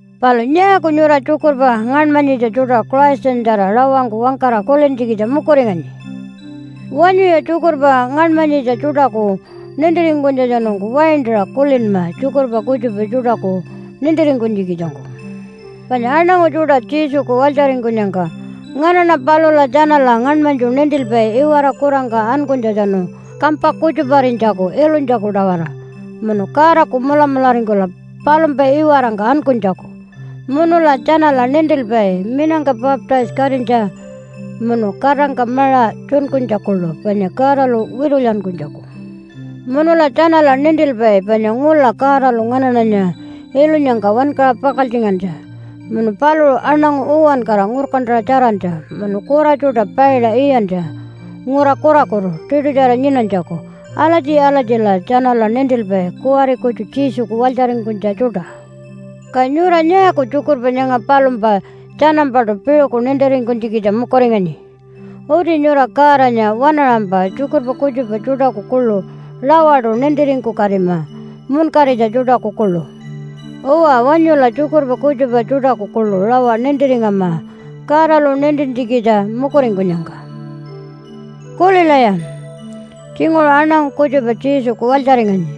Palu nyaaku nyura tjukurpa ngaṉmanyitja tjuṯa Christanyatjara rawangku wangkara kulintjikitja mukuringanyi? Wanyuya tjukurpa ngaṉmanyitja tjuṯaku nintiringkunytjatjanungku waintaṟa kulinma tjukurpa kutjupa tjuṯaku nintiringkunytjikitjangku. Panya aṉangu tjuṯa Jesuku walytjaringkunyangka nganaṉa palula tjanala ngaṉmanytju nintilpai iwara kurangka ankunytjatjanu kampa kutjuparinytjaku ilunytjaku-tawara, munu Godaku mulamularingkula palumpa iwarangka ankunytjaku. Munula tjanala nintilpai minangka baptise-katinytja, munu katangka maṟa tjunkunytja kuḻu panya Godalu witulyankunytjaku. Munula tjanala nintilpai panya ngula Godalu nganaṉanya ilunyangka wankaṟa pakaltjingantja, munu paluṟu aṉangu uwankara ngurkantaṟa tjarantja, munu kura tjuṯa paiṟa iyantja ngura kurakutu tiṯutjara nyinanytjaku. Alatji-alatjila tjanala nintilpai kuwari kutju Jesuku walytjaringkunytja tjuṯa. Ka nyura nyaaku tjukurpa nyanga palumpa tjanampaṯu piṟuku nintiringkunytjikitja mukuringanyi? Uti nyura Godanya waṉaṟampa tjukurpa kutjupa tjuṯaku kuḻu rawaṯu nintiringkukatima munkaritja tjuṯaku kuḻu. Uwa, wanyula tjukurpa kutjupa tjuṯaku kuḻu rawa nintiringama Godalu nintintjikitja mukuringkunyangka. Kulilaya! Tjinguṟu aṉangu kutjupa Jesuku walytjaringanyi.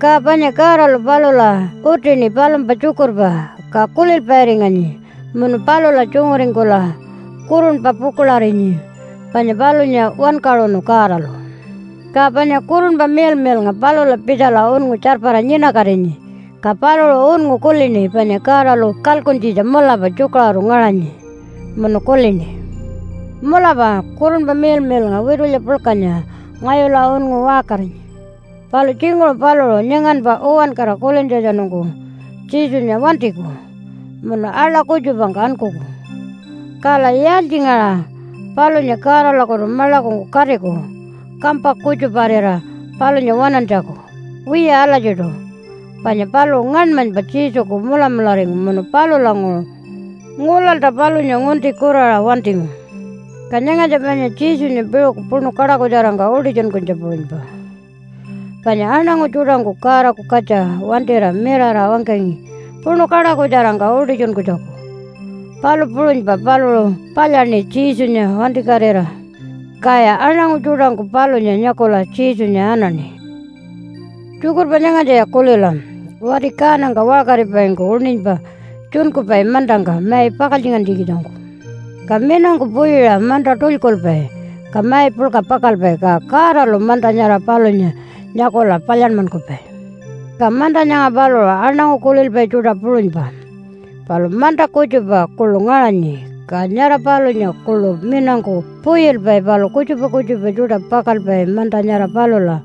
Ka panya Godalu palula utini palumpa tjukurpa, ka kulilpairinganyi munu palula tjunguringkula kurunpa pukuḻarinyi panya palunya wankaṟunu Godalu. Ka panya Kurunpa Miḻmiḻnga palula pitjala unngu tjarpara nyinakatinyi. Ka paluṟu unngu kulini panya Godalu kalkuntjitja mulapa tjukaṟuru ngaṟanyi. Munu kulini, “Mulapa Kurunpa Miḻmiḻnga witulya puḻkanya ngayula unngu waṟkarinyi.” Palu tjinguṟu paluṟu nyanganpa uwankara kulintjatjanungku Jesunya wantiku munu aḻa kutjupangka ankuku, kala yaaltjingaṟa palunya Godalakutu maḻakungku katiku kampa kutjuparira palunya waṉantjaku? Wiya alatjiṯu, panya paluṟu ngaṉmanypa Jesuku mulamularingu munu palulanguṟu ngulalta palunya ngunti kuraṟa wantingu. Ka nyangatja panya Jesunya piṟuku puṉu kaṯakutjarangka utitjunkunytja puṟunypa. Panya aṉangu tjuṯangku Godaku katja wantira mirara wangkangi puṉu kaṯakutjarangka utitjunkunytjaku, palu puṟunypa paluṟu palyaṉi Jesunya wantikatira, kaya aṉangu tjuṯangku palunya nyakula Jesunya anaṉi. Tjukurpa nyangatjaya kulila! Wati kaanangka waṟkaripaingku uṉinypa tjunkupai mantangka mai pakaltjingantjikitjangku. Ka minangku puyiṟa manta tulykulpai ka mai puḻka pakalpai. Ka Godalu manta nyara palunya nyakula palyanmankupai. Ka manta nyanga paluṟu aṉangu kulilpai tjuṯa puṟunypa. Palu manta kutjupa kuḻu ngaṟanyi, ka nyara palunya kuḻu minangku puyilpai palu kutjupa kutjupa tjuṯa pakalpai manta nyara palula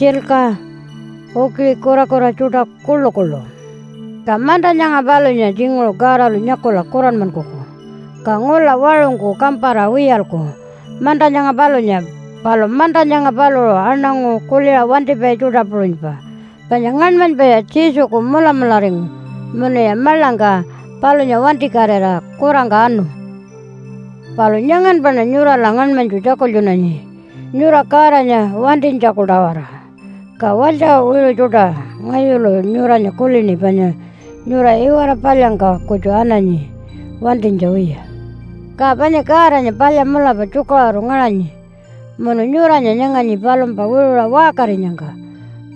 tjilka, ukiṟi kurakura tjuṯa kuḻukuḻu. Ka manta nyanga palunya tjinguṟu Godalu nyakula kuranmankuku. Ka ngula waṟungku kampara wiyalku manta nyanga palunya. Palu manta nyanga paluṟu aṉangu kuliṟa wantipai tjuṯa puṟunypa, panya ngaṉmanypaya Jesuku mulamularingu munuya maḻangka palunya wantikatira kurangka anu. Palu nyanganpaṉa nyurala ngaṉmanytju tjakultjunanyi nyura Godanya wantinytjaku-tawara. Ka walytja wiṟu tjuṯa, ngayulu nyuranya kulini panya nyura iwara palyangka kutju ananyi wantinytja wiya. Ka panya Godanya palya mulapa tjukaṟuru ngaṟanyi, munu nyuranya nyanganyi palumpa wiṟuṟa waṟkarinyangka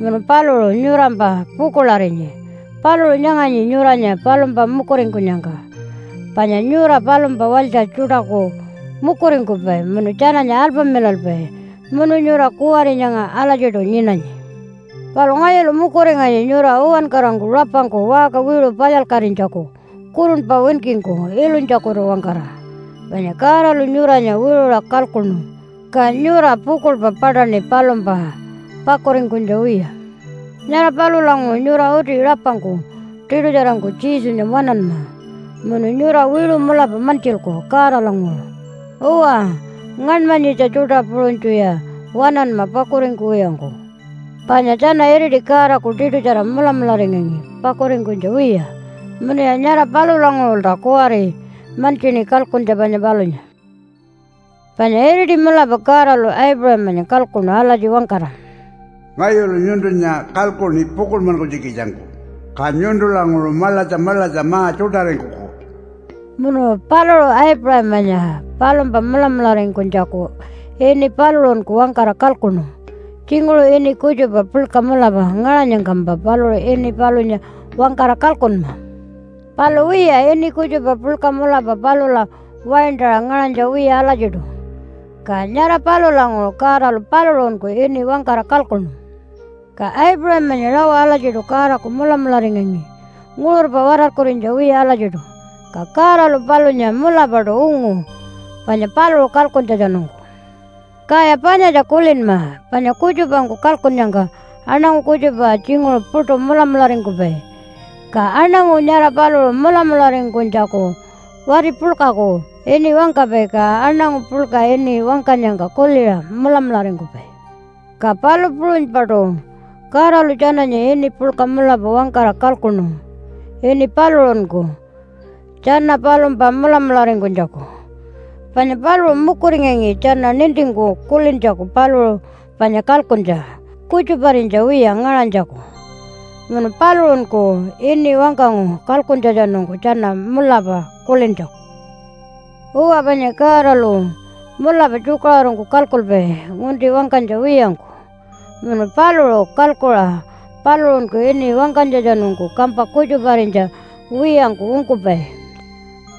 munu paluṟu nyurampa pukuḻarinyi. Paluṟu nyanganyi nyuranya palumpa mukuringkunyangka, panya nyura palumpa walytja tjuṯaku mukuringkupai munu tjananya alpamilalpai. Munu nyura kuwari nyanga alatjiṯu nyinanyi. Palu ngayulu mukuringanyi nyura uwankarangku rapangku waṟka wiṟu palyalkatinytjaku kurunpa winkingku ilunytjakutu-wangkara. Panya Godalu nyuranya wiṟuṟa kalkuṉu, ka nyura pukuḻpa paṯaṉi palumpa pakuringkunytja wiya. Nyara palulanguṟu nyura uti rapangku tiṯutjarangku Jesunya waṉanma munu nyura wiṟu mulapa mantjilku Godalanguṟu. Uwa, ngaṉmanyitja tjuṯa puṟunytjuya waṉanma pakuringkuwiyangku, panya tjana iriti Godaku tiṯutjara mulamularingangi pakuringkunytja wiya munuya nyara palulanguṟulta kuwari mantjini kalkuntja panya palunya. Panya iriti mulapa Godalu Aipuṟamanya kalkuṉu alatji wangkara, “Ngayulu nyuntunya kalkuṉi pukuḻmankunytjikitjangku. Ka nyuntulanguṟu maḻatja maḻatja ma-tjuṯaringkuku.” Munu paluṟu Aipuṟamanya palumpa mulamularingkunytjaku ini paluṟunku wangkara kalkuṉu. Tjinguṟu ini kutjupa puḻka mulapa ngaṟanyangkampa paluṟu ini palunya wangkara kalkunma. Palu wiya, ini kutjupa puḻka mulapa palula waintaṟa ngaṟanytja wiya alatjiṯu. Ka nyara palulanguṟu Godalu paluṟunku ini wangkara kalkuṉu. Ka Aipuṟamanya rawa alatjiṯu Godaku mulamularingangi nguṟurpa watarkurinytja wiya alatjiṯu. Ka Godalu palunya mulapaṯu ungu panya paluṟu kalkuntjatjanungku. Kaya panyatja kulinma, panya kutjupangku kalkunnyangka aṉangu kutjupa tjinguṟu puṯu mulamularingkupai, ka aṉangu nyara paluṟu mulamularingkunytjaku wati puḻkaku ini wangkapai, ka aṉangu puḻka ini wangkanyangka kuliṟa mulamularingkupai. Ka palu puṟunypaṯu Godalu tjananya ini puḻka mulapa wangkara kalkuṉu ini paluṟunku tjana palumpa mulamularingkunytjaku. Panya paluṟu mukuringangi tjana nintingku kulintjaku paluṟu panya kalkuntja kutjuparinytja wiya ngaṟanytjaku. Munu paluṟunku ini wangkangu kalkuntjatjanungku tjana mulapa kulintjaku. Uwa, panya Godalu mulapa tjukaṟurungku kalkulpai ngunti wangkanytja wiyangku, munu paluṟu kalkuṟa paluṟunku ini wangkanytjatjanungku kampa kutjuparinytja wiyangku ungkupai.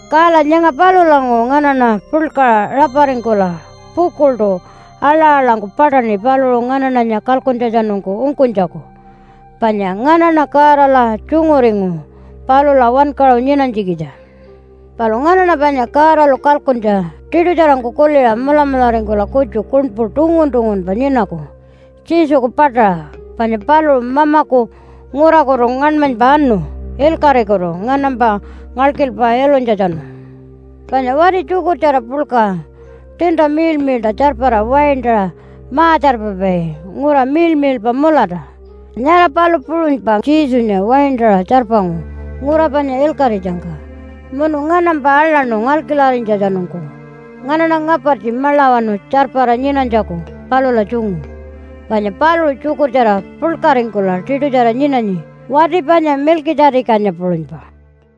Kala nyanga palulanguṟu nganaṉa puḻkaṟa raparingkula pukuḻṯu aḻa-aḻangku paṯaṉi paluṟu nganaṉanya kalkuntjatjanungku ungkunytjaku, panya nganaṉa Godala tjunguringu palula wankaṟu nyinanytjikitja. Palu nganaṉa panya Godalu kalkuntja tiṯutjarangku kuliṟa mulamularingkula kutju kuṉpu tungun-tungunpa nyinaku Jesuku paṯaṟa. Panya paluṟu Mamaku ngurakutu ngaṉmanypa anu ilkaṟikutu nganampa ngalkilpa ilunytjatjanu. Panya wati tjukurtjara puḻka tiinta miḻmiḻṯa tjarpara waintaṟa ma-tjarpapai ngura miḻmiḻpa mulata, nyara palu puṟunypa Jesunya waintaṟa tjarpangu ngura panya ilkaṟitjangka munu nganampa aḻaṉu ngalkilarinytjatjanungku, nganaṉa ngapartji maḻawanu tjarpara nyinanytjaku palula tjungu. Panya paluṟu tjukurtjara puḻkaringkula tiṯutjara nyinanyi wati panya Milkitja-tikanya puṟunypa.